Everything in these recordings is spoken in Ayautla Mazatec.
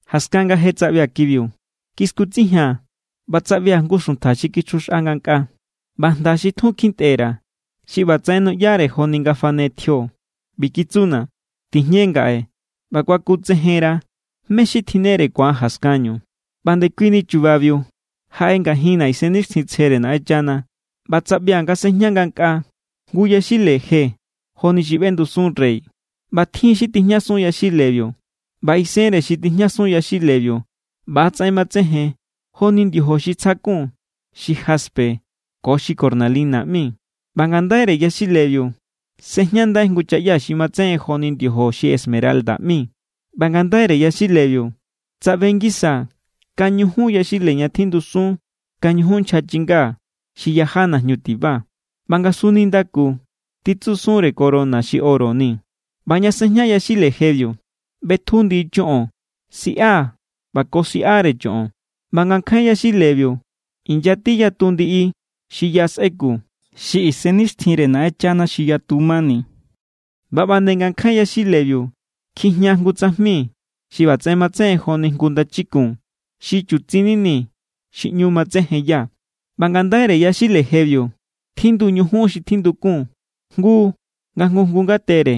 Jaskan nga je tsaꞌbia̱ kibiu, kiskutsejia̱n ꞌba tsaꞌbia̱ jngu xuntja xi kichjuxꞌa ngankꞌaa. ꞌBa jnda xi tjun kjintꞌe_ra̱, xi ꞌbatsaꞌen nuꞌyare joni nga fane tjio ꞌbi kitsuna̱: “Tijñe ngaꞌe ꞌba kuakutsejenra̱ mé= xi tjinnere ku̱an jaskanñu.” ꞌBa ndekuini chubabiu jaꞌe ngajinna̱ Isennixtjintsjere Naꞌenchana, ꞌba tsaꞌbia̱ nga sejña ngankꞌaa jngu yaxile je joni xi ꞌbendusun rey, ꞌba tjin= xi tijñasun yaxilebiu. ꞌBa isenre xi tijñasun yaxilebiu ꞌba=tsaꞌen matsejen joni ndiojo xi tsjakun xi jaspe ko cornalina ꞌmi. ꞌBa ngandaire yaxilebiu sꞌejñandai jngu chaꞌya xi matsejen joni ndiojo xi esmeralda ꞌmi. ꞌBa ngandaire yaxilebiu tsaꞌbe ngisaa̱ kañujun yaxile ña tjindusun kañujun nchja chinga xi yaja najñu tiba, ꞌba ngasun nindaku titsusunre corona xi oro ni. ꞌBa ña sejña yaxile jebiu ꞌbetju ndiꞌi choꞌon, siꞌa ꞌba ko siꞌare choꞌon. ꞌBa ngankjain yaxilebiu inyati yatu ndiꞌi xi ya sꞌeku, xi isennixtjinre Naꞌenchana xi yatu mani. ꞌBa ꞌba nde ngankjain yaxilebiu kjijña jngu tsajmi xi ꞌbatsaꞌen matsejen joni jngu ndachikun xi chutsin nini xi ꞌñu matsejenya. ꞌBa ngandaire yaxile jebiu tjindu ñujun xi tjindukun jngu nga jngu jngu ngatere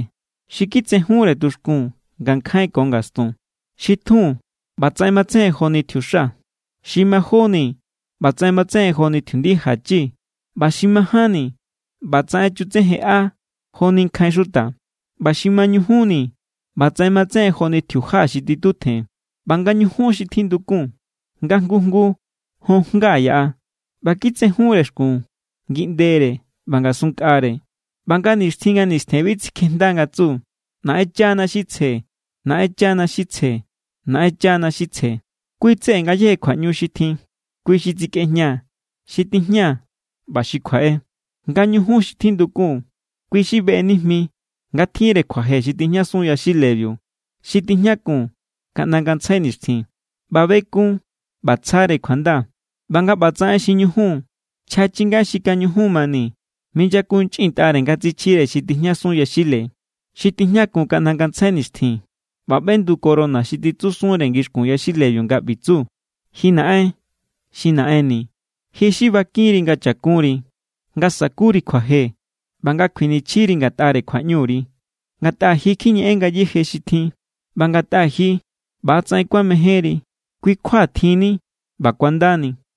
xi kitsejunre tuxkun ngankjain ko ngastun. Xi titjun, ꞌbatsaꞌen matsejen joni tjiuxa. Xi majóni, ꞌbatsaꞌen matsejen joni tjiundija chi. ꞌBa xi majánni, ꞌbatsaꞌen chutsejenꞌa joni nkjain xuta. ꞌBa xi mañujunni, ꞌbatsaꞌen matsejen joni tjiuja xi titutjen. ꞌBa nga ñujun xi tjindukun, nga jngu jngu jon jnga yaꞌa. ꞌBa kitsejunre xkun ngiꞌndere ꞌba ngasunnkꞌare. ꞌBa nga nixtjin nga nistjen bi tsikjejnda nga tsu: Naꞌenchana= xi tsje, Naꞌenchana= xi tsje, Naꞌenchana= xi tsje. Kui= tseꞌe ngayéje kjuaꞌñu xi tjin. Kui xi tsikꞌejña, xi tijña ꞌba xi kjuaꞌe. Nga ñujun xi tjindukun, kui xi beꞌe nijmi nga tjinre kjuaje xi tijñasun yaxilebiu, xi tijñakun kaꞌnda ngantsjai nixtjin. ꞌBa bekun ꞌba tsjare kjuanda. ꞌBa nga ꞌba tsaꞌen xi ñujun, nchja chinga xi kañujun mani minyakunchꞌintꞌare nga tsichjire xi tijñasun yaxile, xi tijñakun kaꞌnda ngantsjai nixtjin. ꞌBa ꞌbendu corona xi titsusunre ngixkun yaxilebiu nga ꞌbi tsu: Ji Naꞌen xi Naꞌenni̱, ji xi bakinri nga cha̱kunri, nga sa̱kuri kjuaje ꞌba nga kjuinichjire ngatꞌare kjuaꞌñuri. Ngatꞌa ji kjiñeꞌen ngayéje xi tjin, ꞌba ngatꞌa ji ꞌbatsaꞌen kuamejénri kui= kjua tjinni ꞌba kuandani.